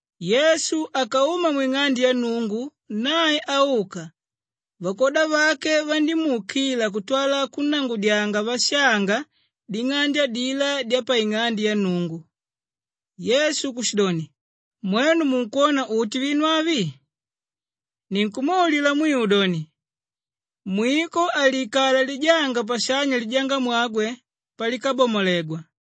Yesu akauma mwing'ande ya Nnungu. Nae auka, vakwoda vake vandímuukila kutwala kunnangudyanga vashanga ding'ande adilá dyapaing'ande ya Nnungu. Yesu kushidoni, “Mwenu munkwona uti vinu avi? Ninkumwaulila mwiu doni, mwiko haliikala lijanga pashanya lijangamwagwe palikabamolegwa.”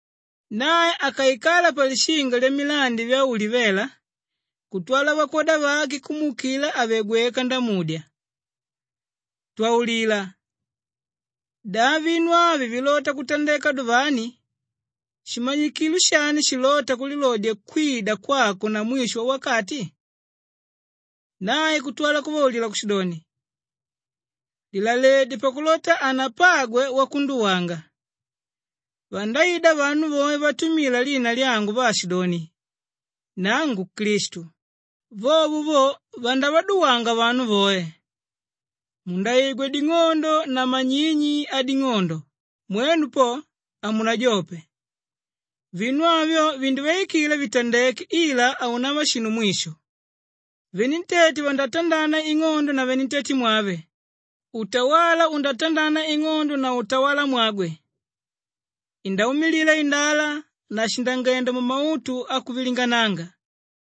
Nae akaikala palishinga lyamilandi vya Ulivela kutwala vakwoda vake kumuukila àve gweka ndamudya, “Twaulila! Da vinu avi vilota kutandeka duvani? Shimanyikilo shani shilóta kulilodya kwida kwako na mwisho wawakati?” Nae kutwala kuvaulila kushidoni, “Lilaledye pakulota hanapagwe wakunduwanga. Vandaida vanu voe vatumila lina lyangu vaashidoni, ‘Nangu Klistu,’ vovo vo vandavaduwanga vanu voe. Mundaigwa ding'ondo na manyinyi ading'ondo, mwenu po, hamunajope. Vinu avyo vindivaikila vitandeke ila haunava shinu mwisho. Venentete vandatandana ing'ondo na venentetemwave, utawala undatandana ing'ondo na utawalamwagwe. Indaumilila indala na shindangenda mumautu akuvilingananga.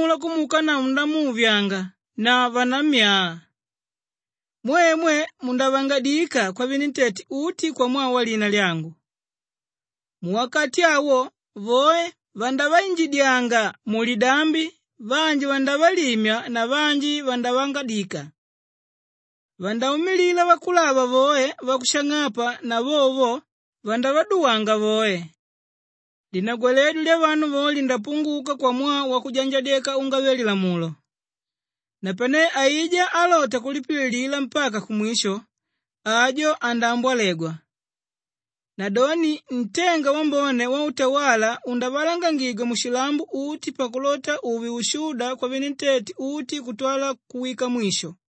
“Napanelo vanavo vanankamula kumuukanavo ndamuuvyanga na vanammyaa. Mwemwe mundavangadika kwavenentete uti kwamwaa walina lyangu. Muwakati awo voe vandavainjidyanga mulidambi, vanji vandavalimya na vanji vandavangadika. Vandaumilila vakulava voe vakushang'apa na vovo vo, vandavaduwanga voe. Linagwaledyo lyavanu voe lindapunguka kwamwaa wakwanjadyeka ungave-lilamulo, napane aijá álota kulipililila mpaka kumwisho, ajo andaambwalegwa. Nadoni ntenga wambone wautawala undavalangangigwa mushilambo uti pakulota uve ushuda kwavenentete uti kutwala kuwika mwisho.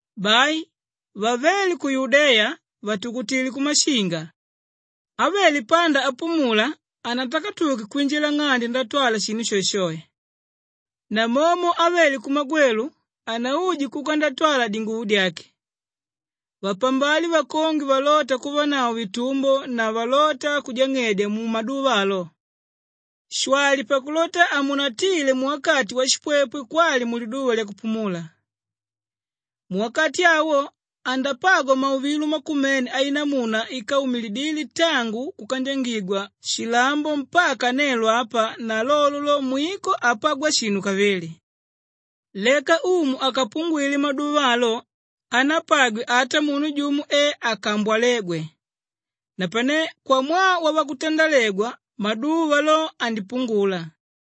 Bai vavéle ku Yudeya vatukutile kumashinga. Ávele panda apumula hanatakatuke kwinjila nng'ande ndatwala shinu shoeshoe. Namomo ávele kumagwelu hanauje kuka ndatwala dinguvo dyake. Vapambale vakongwe valóta kuvanavo vitumbo na valóta kujang'edya mumaduva alo. Shwali pakulota hamunatile muwakati washipwepwe kwali muliduva lyakupumula. Muwakati awo andapagwa mauvilo makumene ainamuna íkaumilidile tangu kukandyangigwa shilambo mpaka nelo apa na lolo lo, mwiko hapagwa shinu kavili. Leka Umu akapungwile maduva alo hanapagwe ata munu jumo e akambwalégwe, napane kwamwaa wavakutandalegwa, maduva lo, andipungula.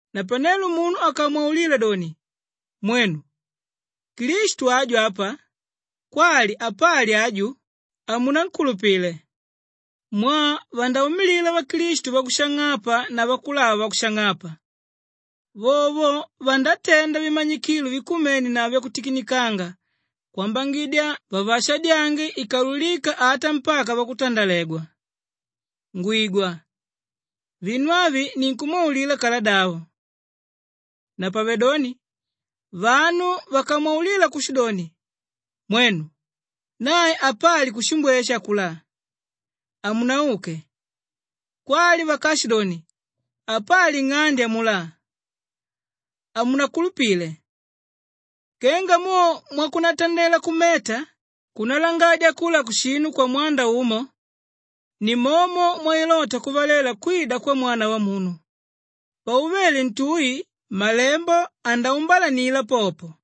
“Napanelo munu akamwaulila doni, ‘Mwenu, Klistu aju apa,’ kwali, ‘Apali aju,’ hamunankulupile. Mwaa vandaumilila vaklistu vakushang'apa na vakulava vakushang'apa. Vovo vandatenda vimanyikilo vikumene na vyakutikinikanga kwambangidya vavaashadyange ikaululika ata mpaka vakutandalegwa. Ngwigwa! Vinu avi nimwaulila kaladavo. “Napavedoni vanu vakamwaulila kushidoni, ‘Mwenu! Nae apali kushimbweshe akulá,’ hamunauke. Kwali vakaashidoni, ‘Apali nng'ande amulá,’ hamunakulupile. Kenga mo mwakunatandela kumeta kúnalangadya kula kushinu kwamwanda umo ni momo mwailota kuvalela kwida kwa Mwana Wamunu. Pauvele ntui, malembo andaumbalanila popo.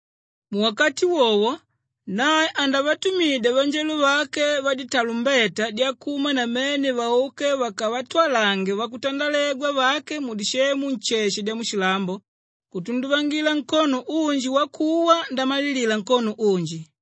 Muwakati wowo nae andavatumidya vanjelo vake vaditalumbeta dyakuma namene vauke vakavatwalange vakutandalegwa vake mudisemu nsheshe dyamushilambo kutunduvangila nkono unji wakuwa ndamalilila nkono unji.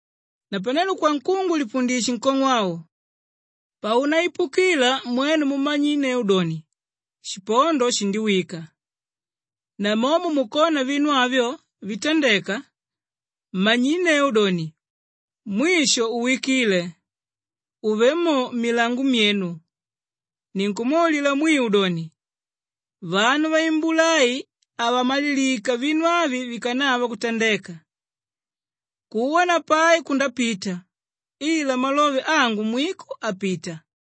“Napanelo kwankungu lipundishe nkong'o au. Paunaipukila mwenu mumanyinneu doni, shipondo shindiwika. Namomo mukona vinu avyo vitandeka, manyinneu doni, mwisho uwikile, uvé mo mmilango myenu. Ninkumwaulila mwiu doni, vanu vaimbula ai havamalilika vinu avi vikanava kutandeka. Kuwa na pai kundapita ila malove angu mwiko hapita.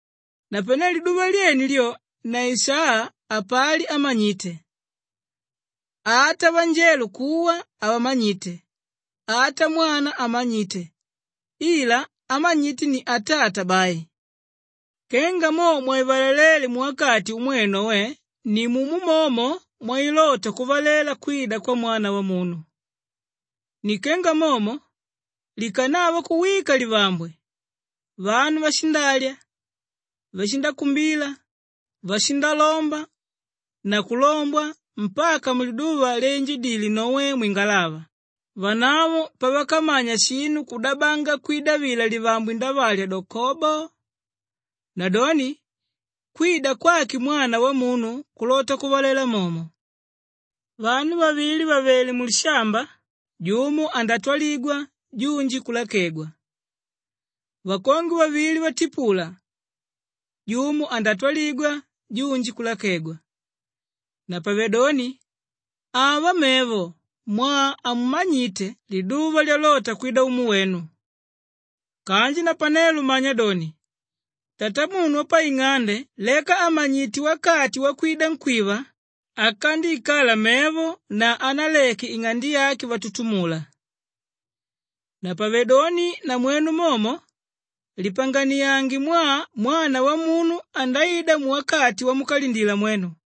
“Napane liduva lyene lyo na isaa, hapali ámanyite, ata vanjelo kuwa havamanyite, ata Mwana hamanyite ila ámanyite ni Atata bai. Kenga mo mwaivalaléle muwakati umwe Noe nimumo momo mwailota kuvalela kwida kwa Mwana Wamunu. Ni kenga momo likanava kuwika livambwe, vanu vashindalya, vashindakumbila, vashindalomba na kulombwa mpaka muliduva lyainjidile Noe mwingalava vanavo pavakamanya shinu kudabanga kwida vila livambwe ndavalya do kobo! Nadoni kwida kwake Mwana Wamunu kulota kuvalela momo. Vanu vavili vàvele mulishamba, jumo andatwaligwa junji kulakegwa. Vakongwe vavili vatipula, jumo andatwaligwa junji kulakegwa. Napavedoni ava mevo mwaa hamumanyite liduva lyalota kwida Umu wenu. Kanji napanelo manya doni, tatamunu wapaing'ande leka àmanyite wakati wakwida nkwíva, akandiikala mevo na hanaleke ing'ande yake vatutumula. Napavedoni namwenu momo lipanganiange mwaa Mwana Wamunu andaida muwakati wamukalindila mwenu.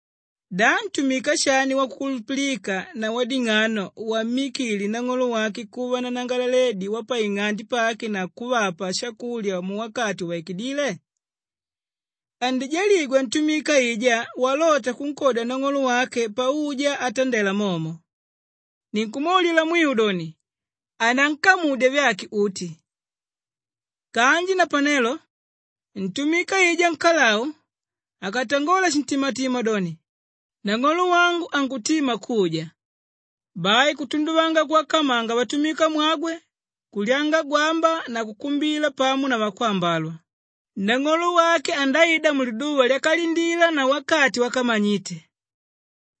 “Da ntumika shani wakukulupilika na wading'ano wammikile nang'olo wake kuva nanangalaledi wapaing'ande pake na kuvapa shakulya muwakati uvaikidíle? Andijaligwa ntumika aijá walota kunkodya nang'olo wake pauja atandela momo. Ninkumwaulila mwiu doni, anankamudya vyake uti. Kanji napanelo ntumika aijá nkalau akatangola shintimatima doni, ‘Nang'olo wangu ankutima kuja,’ bai kutunduvanga kuvakamanga vatumikamwagwe, kulyanga gwamba na kukumbila pamo na vakwambalwa, nang'olo wake andaida muliduva lyakalindila na wakati wakamanyite.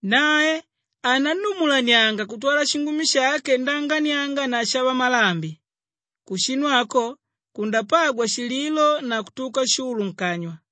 Nae anannumulanianga kutwala shingumi shake ndaanganianga na shavamalambi. Kushinu ako kundapagwa shililo na kutuka shulu nkanywa.